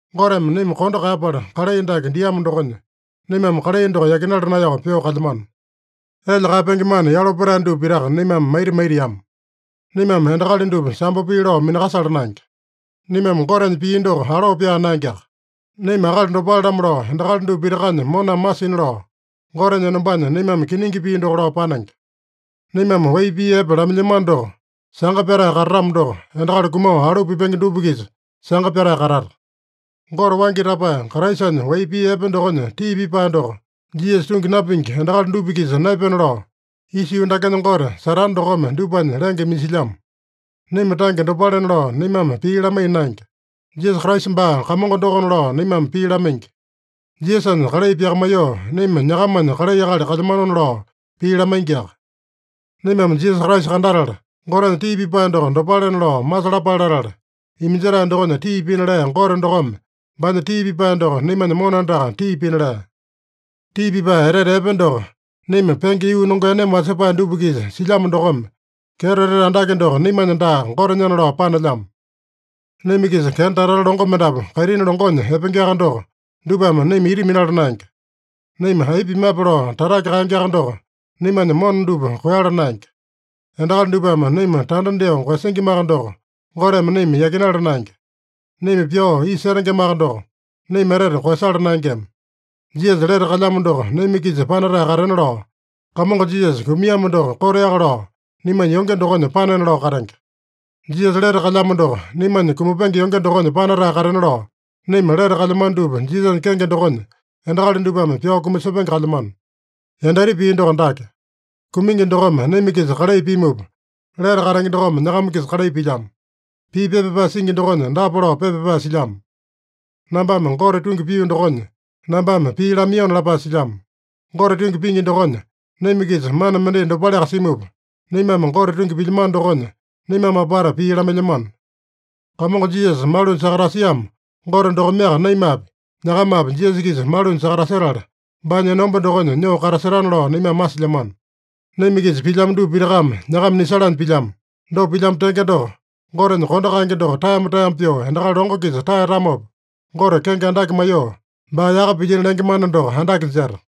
Goteme naima kondo kaeyapala kalai dake diamo dokonya, naimame kalai doko yakinala naeyao pyoo kalyamano. Elya kaeyapenge mana yalo petae dupa pitaka naimame maita maitiama. Naimame endakali dupa sambo pii lao minakasala naenge. Naimame Gotenya pii doko aloo pyaa naengeaka. Naima akali dopale-lamo lao endakali dupa pitakanya moname masina lao, Gotenya enombanya naimame kiningi pii doko lao panenge. Naimame wai pii epe lamailyamano doko sanga pyatae katatamo doko, endakali kumao alu pipenge dupa-kisa sanga pyatae katata. Gote waingi tapae Kraisanya wai pii epe dokonya tii pipae doko Jisasa tungi napingi endakali dupa-kisa naepena lao, isa yuu dakenya gote, Satane dokome dupanya lenge iminjilyamo. Naima tange dopalena lao naimame pii lamaiya naenge. Jisasa Kraisa baa Kamongo dokona lao naimame pii lamaingi. Jisasanya kalai pyakamaiyoo, naima nyakamanya kalai akali kalyamanona lao pii lamaingiaka. Naimame Jisasa Kraisa kandatala, Gotenya tii pipae doko dopalena lao masalapale latala, iminjetae dokonya tii pina lea Gote dokome baanya tii pipae doko naimanya mona andaka tii pina lea. Tii pipae etete epe doko naima penge yuu nongeaneme wasepae dupa-kisa silyamo dokome, kyeto etete andake doko naimanya daa, Gotenyana lao panelyamo. Naima-kisa kenda tata-tata longo mendapu kaitini longonya epengeaka doko, dupame naima ita minala naenge. Naima aipa pimape lao tatake kaengeaka doko, naimanya mona dupa koeyala naenge. Endakali dupame naima tanda dyoo koeyasingimaka doko, Goteme naima yakinala naenge. Naima pyao isa setengemaka doko, naima etete koeyasala naengema. Jisasa lete kalyamo doko naima-kisa panatae katena lao, Kamongo Jisasa kumiamo doko koteaka lao naimanya yonge dokonya panena lao katenge. Jisasa lete kalyamo doko naimanya kumapenge yonge dokonya panatae katena lao, naima lete kalyamano dupa Jisasanya kenge dokonya, endakali dupame pyao kumasepenge kalyamano. Yandaita pii doko dake: Kumingi dokome naima-kisa kalai pimupa, lete katenge dokome nyakama-kisa kalai pilyamo. Pii pepa pyapae singi dokonya dapa lao pepa pyapae silyamo: “Nambame Gote tungi pio dokonya, nambame pii lamaiyona” lapae silyamo. Gote tungi pingi dokonya naima-kisa mana mendai dopaleaka simupa, naimame Gote tungi pilyamano dokonya, naimame apata pii lamailyamano. Kamongo Jisasa malunya sakatasiamo Gote dokomeaka naimapi, nyakamapi Jisasa-kisa malunya sakatasetala, baanya enomba dokonya nyoo katasetana lao naimame masilyamano. Naima-kisa pilyamo dupa pitakame nyakama nisalanya pilyamo. Dopa pilyamo tenge doko, Gotenya kondo kaenge doko taeyama-taeyama pyoo endakali longo-kisa taeyatamopa, Gote kenge andake maiyoo, baa yaka pilyino lenge mana doko andake jeta.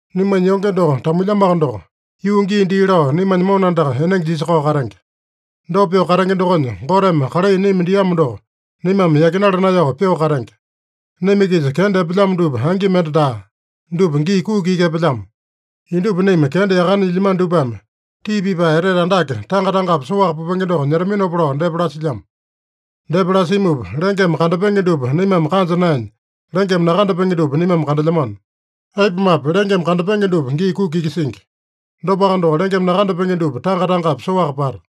Naimanya yonge doko tamuilyamoaka doko, yuu gii dii lao naimanya mona andaka enenge jisakao katenge. Dopa pyoo katenge dokonya, Goteme kalai naima diamo doko naimame yakinala naeyao pyoo katenge. Naima-kisa kenda epelyamo dupa angi mende daa. Dupa gii kuki iki epelyamo. Indupa naima kenda yakane nyilyamano dupame, tii pipae etete andake tanga-tangapi soaka pupenge doko nyetaminopa lao depa lasilyamo. Depa lasimupa, lengeme kandapenge dupa naimame kanja naenya, lengeme nakandapenge dupa naimame kandelyamano. Aipumape, lengeme kandapenge dupa gii kuki iki singi. Dopaka doko, lengeme nakandapenge dupa tanga-tangapi soaka pata.